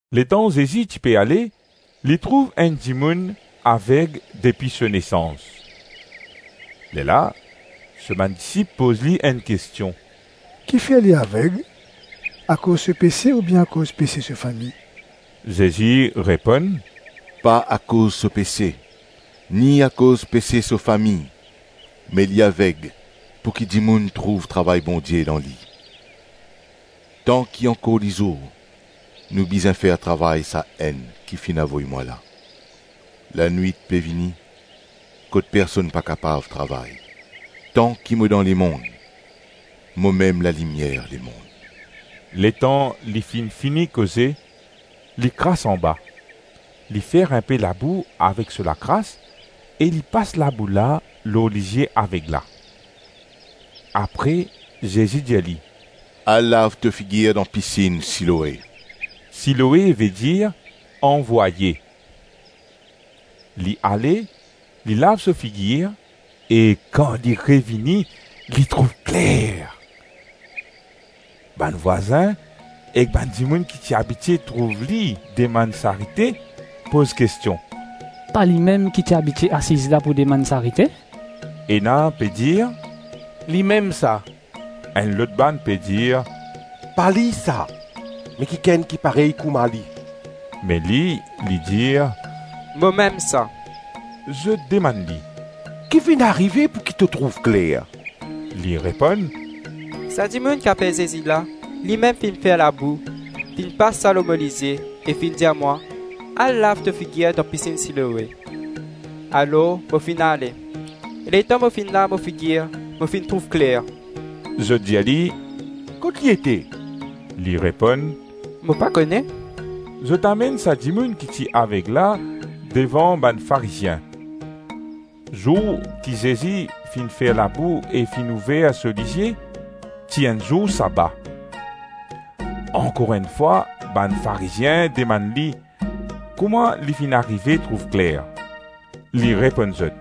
Letan Zezi ti pe ale, li trouv enn dimoun aveg depi so nesans. Lerla so bann disip poz li enn kestion, “Kifer li aveg, akoz so pese ou bien akoz pese so fami?” Zezi reponn, “Pa akoz so pese, ni akoz pese so fami me li aveg pouki dimoun trouv travay Bondie dan li.” Tanki ankor lizour, nou bizin fer travay Sa-Enn ki finn avoy mwa la; lanwit pe vini kot personn pa kapav travay. Tanki mo dan lemonn, momem lalimier lemonn.” Letan li finn fini koze, li kras anba, li fer inpe labou avek so lakras e li pas labou lor lizie aveg la. Apre Zezi dir li, “Al lav to figir dan pisinn Siloe” (Siloe vedir, ‘anvwaye’). Li ale, li lav so figir e kan li revini, li trouv kler. Bann vwazin ek bann dimoun ki ti abitie trouv li demann sarite, poz kestion, “Pa limem ki ti abitie asiz la pou demann sarite?” Ena pe dir, “Limem sa.” Enn lot bann pe dir, “Pa li sa, me kikenn ki parey kouma li.” Me li, li dir, “Momem sa.” Zot demann li, “Ki finn arive pouki to trouv kler?” Li reponn, “Sa dimoun ki apel Zezi la, limem finn fer labou, finn pas sa lor mo lizie e finn dir mwa, ‘Al lav to figir dan pisinn Siloe.’ Alors mo finn ale e letan mo finn fini lav mo figir, mo finn trouv kler.” Zot dir li, “Kot li ete?” Li reponn, “Mo pa kone.” Zot amenn sa dimoun ki ti aveg la devan bann Farizien. Zour ki Zezi finn fer labou e finn ouver so lizie, ti enn zour saba. Ankor enn fwa, bann Farizien demann li kouma li finn arive trouv kler. Li reponn zot,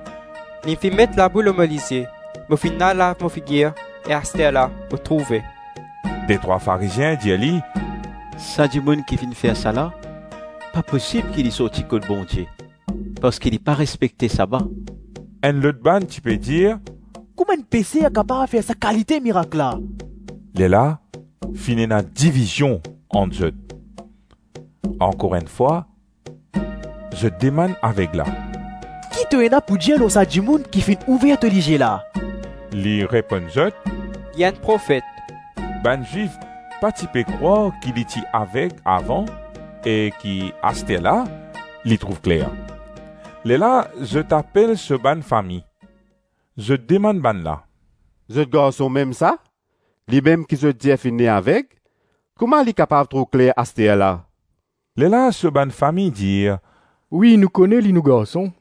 “Li finn met labou lor mo lizie, mo finn al lav mo figir e asterla mo trouve.” Detrwa Farizien dir li, “Sa dimoun ki finn fer sa la, pa posib ki li sorti kot Bondie, parski li pa respekte saba.” Enn lot bann ti pe dir, “Kouma enn peser kapav fer sa kalite mirak la?” Lerla finn ena divizion ant zot. Ankor enn fwa zot demann aveg la, “Ki to ena pou dir lor sa dimoun ki finn ouver to lizie la?” Li reponn zot, “Li enn Profet.” Bann Zwif pa ti pe krwar ki li ti aveg avan e ki asterla li trouv kler. Lerla zot apel so bann fami. Zot demann bannla, “Zot garson mem sa? Limem ki zot dir finn ne aveg? Kouma li kapav trouv kler asterla?” Lerla so bann fami dir, “Wi, nou kone li nou garson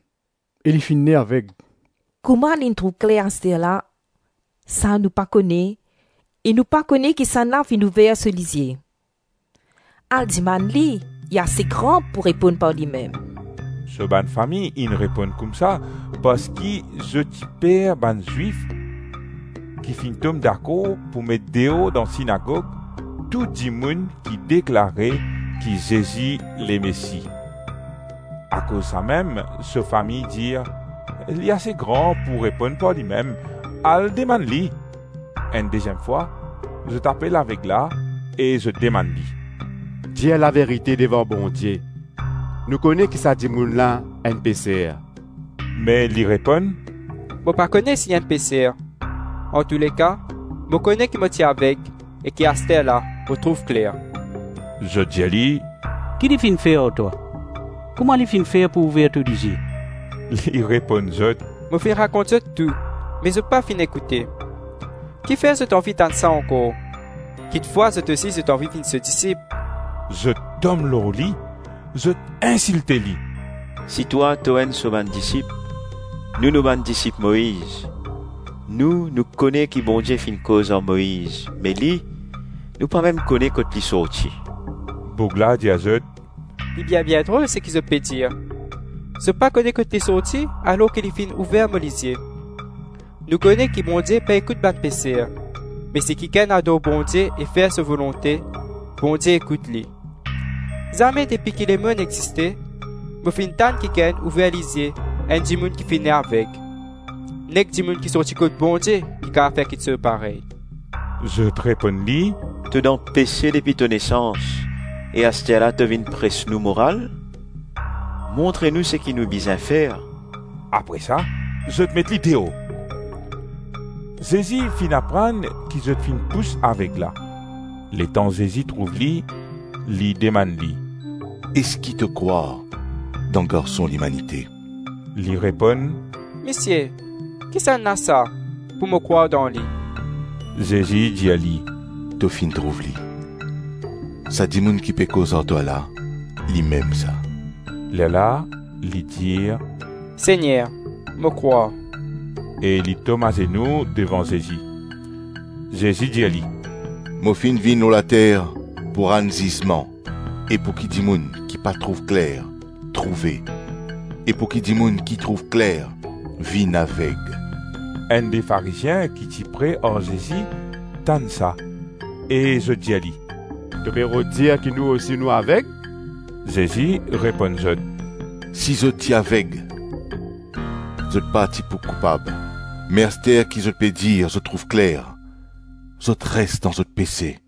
e li finn ne aveg. Kouma li trouv kler asterla, sa nou pa kone e nou pa kone kisannla finn ouver so lizie; al demann li, li ase gran pou reponn par limem.” So bann fami inn reponn koumsa, parski zot ti per bann Zwif ki finn tom dakor pou met deor dan sinagog tou dimoun ki deklare ki Zezi Lemesi. Akoz samem so fami dir, ‘Li ase gran pou reponn par limem, al demann li.’ Enn deziem fwa, zot apel aveg la e zot demann li, “Dir laverite devan Bondie, nou kone ki sa dimoun la enn peser.” Me li reponn, “Mo pa kone si li enn peser; antouleka, mo kone ki mo ti aveg e ki asterla mo trouv kler.” Zot dir li, “Ki li finn fer ar twa? Kouma li finn fer pou ouver to lizie?” Li reponn zot, “Mo finn rakont zot tou, me zot pa finn ekoute; kifer zot anvi tann sa ankor? Kikfwa, zot osi, zot anvi vinn so disip?” Zot tom lor li, zot insilte li, “Si twa to enn so bann disip, nou, nou bann disip Moiz. Nou, nou kone ki Bondie finn koz ar Moiz, me li, nou pa mem kone kot li sorti.” Boug la dir zot, “Li bien-bien drol seki zot pe dir! Zot pa kone kot li sorti alors ki li finn ouver mo lizie. Nou kone ki Bondie pa ekout bann peser me si kikenn ador Bondie e fer so volonte, Bondie ekout li. Zame depi ki lemonn existe, mo finn tann kikenn ouver lizie enn dimoun ki finn ne aveg. Nek dimoun ki sorti kot Bondie ki kapav fer kiksoz parey.” Zot reponn li, “To dan pese depi to nesans e asterla to vinn pres nou moral? Montre nou seki nou bizin fer?” Apre sa, zot met li deor. Zezi finn aprann ki zot finn pous aveg la; letan Zezi trouv li, li demann li, “Eski to krwar dan Garson Limanite?” Li reponn, “Misie, kisannla sa, pou mo krwar dan li?” Zezi dir li, “To finn trouv li. Sa dimoun ki pe koz ar twa la, limem sa.” Lerla li dir, “Segner, mo krwar.” E li tom azenou devan Zezi. Zezi dir li, “Mo finn vinn lor later pou rann zizman e pouki dimoun ki pa trouv kler, trouve, e pouki dimoun ki trouv kler, vinn aveg.” Enn-de Farizien ki ti pre ar Zezi tann sa e zot dir li, “To pe rod dir ki nou osi nou aveg?” Zezi reponn zot, “Si zot ti aveg, zot pa ti pou koupab me aster ki zot pe dir, zot trouv kler, zot res dan zot pese.”